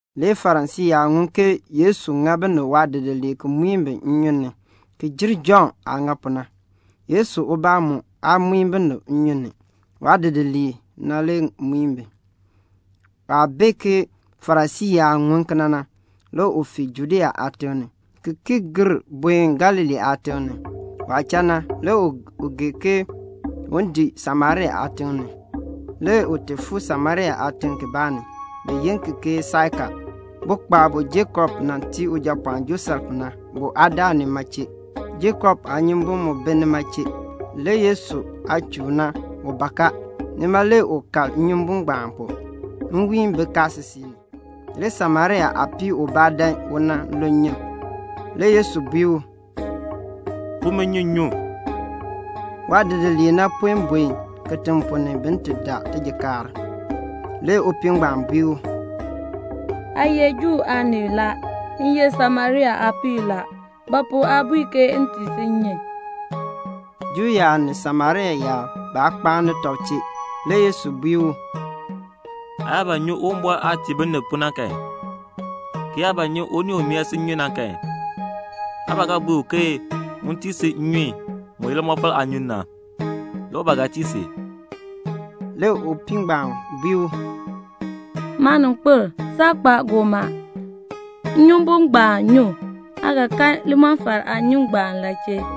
Le Farisii yaab ŋun ke Yesu ŋa binib waadidiliib ki muin bi nnyun ni ki jer Jɔnn aah ŋa pu na. (Yesu ubaa mu aa muin binib nnyun ni. Waadidiliib na le muin bi.) Waah bee ke Farisii yaab ŋun kena na, le u fii Judea aatiŋ ni, ki ki gir buen Galilee aatiŋ ni. Waah cha na, le u gee ke u dii Samaria aatiŋ ni. Le u ti fuu Samaria aatiŋ kibaa ni, bi yi ki ke Saika. Bukpaab bu Jakob nan tii ujapɔɔn Josef na, bu aa daa nima chee. Jakob aanyumbun mu bi nima chee. Le Yesu aah chuun na, u bak a. Nima le u kal nnyumbun ngbaan pu. Nwiin bi kaasisik ni. Le Samaria aapii ubaa dan u nan lu nnyun. Le Yesu bui u, "Pu mi nnyun m nyu." Waadidiliib na puen buen kitiŋ ponn ni bin ti daa tijikaar. Le upii ngbaan bui u, "Aa ye Juu aanii la, m ye Samaria aapii la. Ba pu aa bui m tii si nnyun?" Juu yaab ni Samaria yaab, baa kpaani tɔb chee. Le Yesu bui u, "Aa yaa ba nyi Uwumbɔr aah tii binib pu na kan, ki yaa ba nyi unii u mee si nnyun na kan, aa ba ga bui u ke un tii si nnyun mu ye limɔfal aanyun na, le u ba ga tii si." Le upii ngbaan bui u, "Maaninkpil, saa kpa goomaa, nnyumbun ngbaan nyoo, aa ga kan limɔfal aanyun ngbaan la chee?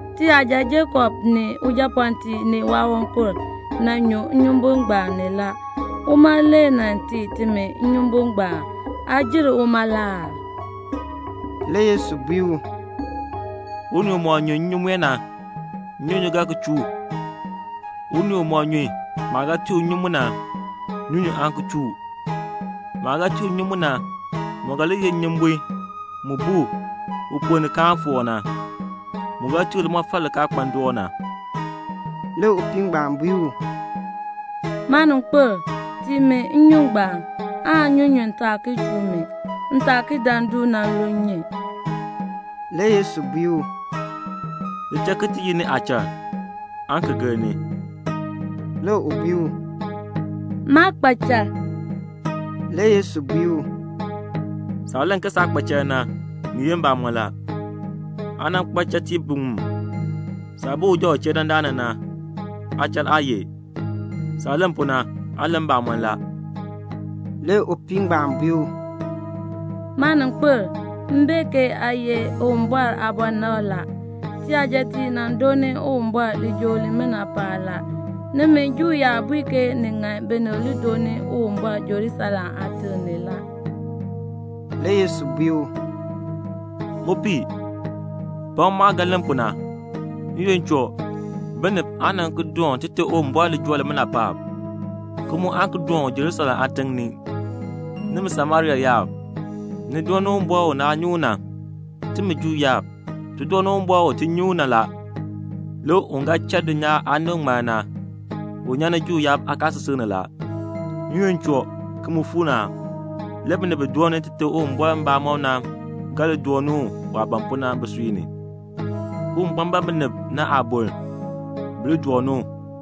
Tiyaja Jakob ni ujapɔɔtiib ni waawankur nan nyu nnyumbun ngbaan ni la. Uma le nan tii timi nnyumbun ngbaan. Aa jer uma la aa?" Le Yesu bui u, "Unii umɔk nyu nnyun mue na, nnyunyun ga ki chuu u. Unii umɔk nyu maah ga tii u nnyun mu na, nnyunyun aan ki chuu u. Maah ga tii u nnyun mu na, mu ga li ye nnyumbun mu bu u ponn ni kaan foor na, mu ga tii u limɔfal li kaa kpa ndoon na." Le upii ngbaan bui u, "Maaninkpil, tii mi nnyun ngbaan aan nnyunyun taa ki chuu mi, m taa ki dan du nan lu nnyun." Le Yesu bui u, "Li cha ki ti yi ni aachal, aan ki gir ni." Le u bui u, "Maa kpa chal." Le Yesu bui u, "Saah len ke saa kpa chal na, ni ye mbamɔn la. Aa nan kpa chatiib biŋmu. Saah bi uja u chee dandana na, aachal aa ye. Saah len pu na, aa len mbamɔn la." Le upii ngbaan bui u, "Maaninkpil, m bee ke aa ye Uwumbɔr aabɔnabr la. Tiyajatiib nan dooni Uwumbɔr lijool limina paab la. Nimi Juu yaab bui ke ni ŋan binib li dooni Uwumbɔr Jerusalem aatiŋ ni la." Le Yesu bui u, "Upii, pakn maah ga len pu na, n-yoonn choo, binib aan nan ki doon Tite Uwumbɔr lijool limina paab, ki mu aan ki doon u Jerusalem aatiŋ ni. Nimi Samaria yaab, ni dooni Uwumbɔr u naa nyi u na. Timi Juu yaab, ti dooni Uwumbɔr u ti nyi u na la. Le un ga cha dulnyaa aanib ŋmar na, u nyan ni Juu yaab aakaasisik ni la. N-yoonn choo, ki mu fuu ni a, le binib bi dooni Tite Uwumbɔr mbamɔm na ga li dooni u waah ban pu na bisui ni. Uwumbɔr ban binib na aaboln, bi li dooni u.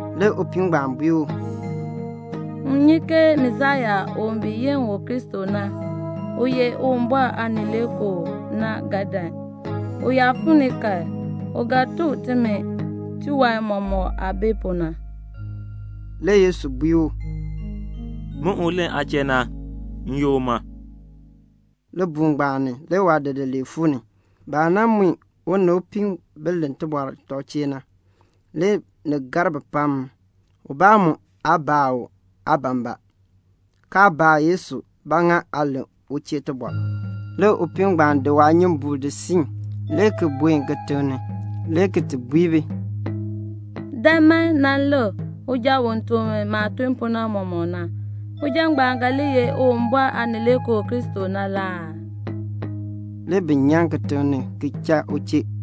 Le upii ngbaan bui u, "M nyi ke Masiya u bi yi u ke Kristo, u ye Uwumbɔr Aanileekoo na ga dan. U yaa fuu ni kan, u ga nan tuk timi tiwan mɔmɔk aah bi pu na." Le Yesu bui u, "Min u len aa chee na, m ye uma." Libuul ngbaan ni le waadidiliib fuu ni. Baah nan mui u ni upii bi len tɔb chee tibɔr na, le ni gar bi pam; ubaa mu aa baa u, "Aa ban ba?" kaa baa Yesu, "Ba pu aa len u chee tibɔr?" Le upii ngbaan di waanyumbuul di siin, le ki buen kitiŋ ni, le ki ti bui bi, "Dan man nan lik uja u tuk mi maah nan tun pu na mɔmɔk na. Uja ngbaan ga li ye Uwumbɔr Aanileekoo Kristo la aa?" Le bi nyan kitiŋ ni ki cha u chee.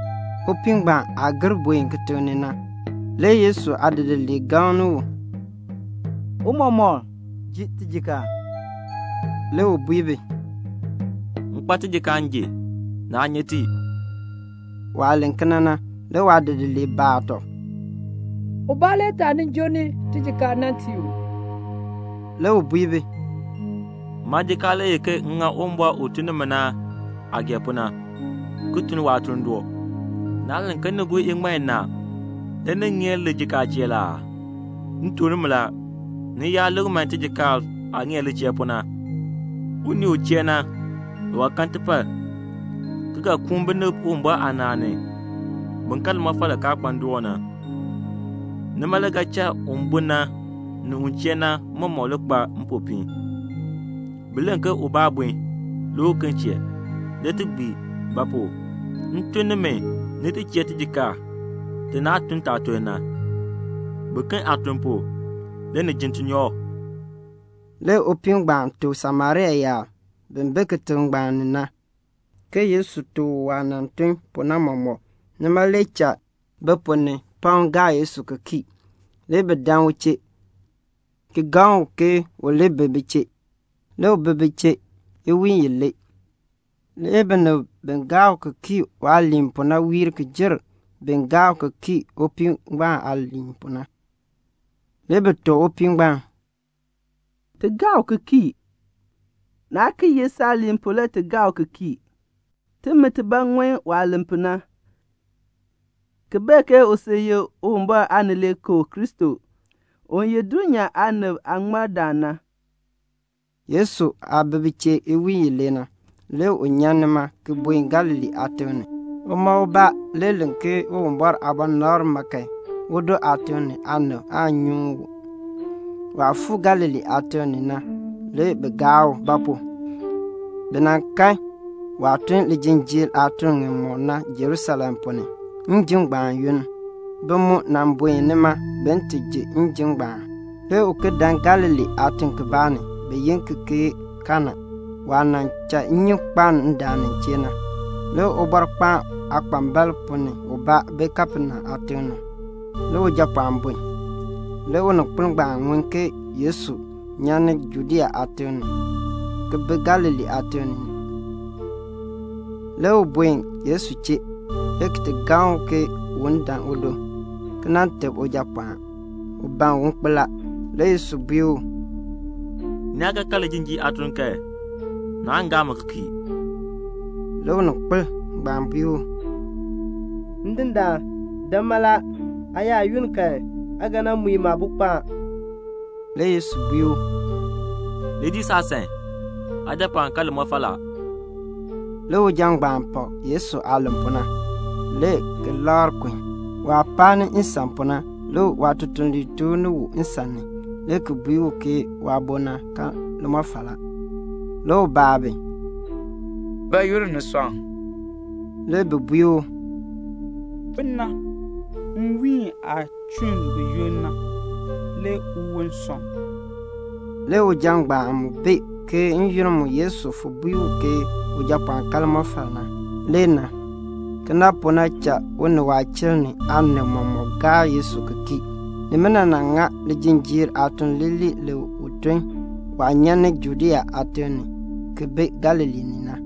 Upii ngbaan aah gir buen kitiŋ ni na, le Yesu aadidiliib gaŋni u, "Tiicha, ji tijikaar." Le u bui bi, "M kpa tijikaar m ji. Naa nyi ti." Waah len kena na le waadidiliib baa tɔb, "Ubaa le taanin joo ni tijikaar nan tii u uu?" Le u bui bi, "Maajikaar le ye ke m ŋa Uwumbɔr u tun ni mi na aah gee pu na, ki tun waatuln doo. Naa len ke ni gur iŋmal inaa le ni ŋeer lijikaacheer aa? M tuk nimi la, ni yaar lik man tijikaar aah ŋeer licheer pu na. Unii u chee na, u ga kan tipar, ki ga koon binib Uwumbɔr aanaan ni, bin kan limɔfal li kaa kpa ndoon na. Nima le ga cha un bun na ni un chee na mɔmɔk li kpa mpopiin. Bi len ke 'Ubaa bun, le uken chee', le ti gbii; ba pu? m tun nimi ni ti chee tijikaar ti naa tun taatuln na. Biken aatuln pu, le ni jin tinyoor." Le upii ngbaan tuk Samaria yaab bi bi kitiŋ ngbaan ni na ke Yesu tuk u waah nan tun pu na mɔmɔk, nima le cha bi ponn ni pam gaa Yesu ki kii. Le bi dan u chee, ki gaŋ u ke u li bi bi chee. Le u bi bi chee iwiin ilee. Le binib bi gaa u ki kii waaliin pu na wiir ki jer bin gaa u ki kii upii ngbaan aaliin pu na. Le bi tuk upii ngbaan, "Ti gaa u ki kii; naa ki ye saaliin pu le ti gaa u ki kii. Timi tibaa ŋun waah len pu na, ki bee ke u sil ye Uwumbɔr Aanileekoo Kristo, u ye dulnyaa aanib aaŋmardaan na." Yesu aah bi bi chee iwiin ilee na, le u nyan nima ki buen Galilee aatiŋ ni. Uma ubaa le len ke Uwumbɔr aabɔnabr ma kan, udo aatiŋ ni aanib aan nyuŋ u. Waah fuu Galilee aatiŋ ni na le bi gaa u; ba pu? bi nan kan waah tun lijinjiir aatun ŋimɔk na Jerusalem ponn ni, njim ngbaan yoonn; bi mu nan buen nima bin ti ji njim ngbaan. Le u ki dan Galilee aatiŋ kibaa ni, bi yi ki ke Kana, waah nan cha nnyun kpaln ndaan nin chee na. Le ubɔrkpaan aakpambalb ponn ni ubaa bi Kapenaum aatiŋ ni. Le ujapɔɔn bun. Le uninkpil ngbaan ŋun ke Yesu nyan ni Judea aatiŋ ni ki bi Galilee aatiŋ ni. Le u buen Yesu chee, le ki ti gaŋ u ke un dan udo, ki nan teb ujapɔɔn; u ban un kpo la. Le Yesu bui u, "Ni yaa kaa kan lijinjiir aatun kan, naan gaa mi ki kii." Le uninkpil ngbaan bui u, "Ndindaan, dan mala. Aa yaa yunn kan aa ga nan mui maabo kpo a." Le Yesu bui u, "Li dii saasan. Aajapɔɔn kan limɔfal la." Le uja ngbaan pak Yesu aah len pu na, le ki labr kun. Waah paani nsan pu na le waatutuliib tooh ni u nsan ni le ki bui u ke waabo na kan limɔfal la. Le u baa bi, "Bayoonn ni sɔŋ?" Le bi bui u, "Fon na, nwiin aah chɔnn buyoonn na, le uwon sɔŋ." Le uja ngbaan mu bee ke n-yoonn mu Yesu fon bui u ke ujapɔɔn kan limɔfal na. Kena pu na cha u ni waachiln ni aanib mɔmɔk gaa Yesu ki kii. Nimina nan ŋa lijinjiir aatuln leeler le u tun waah nyan ni Judea aatiŋ ni ki bi Galilee ni na.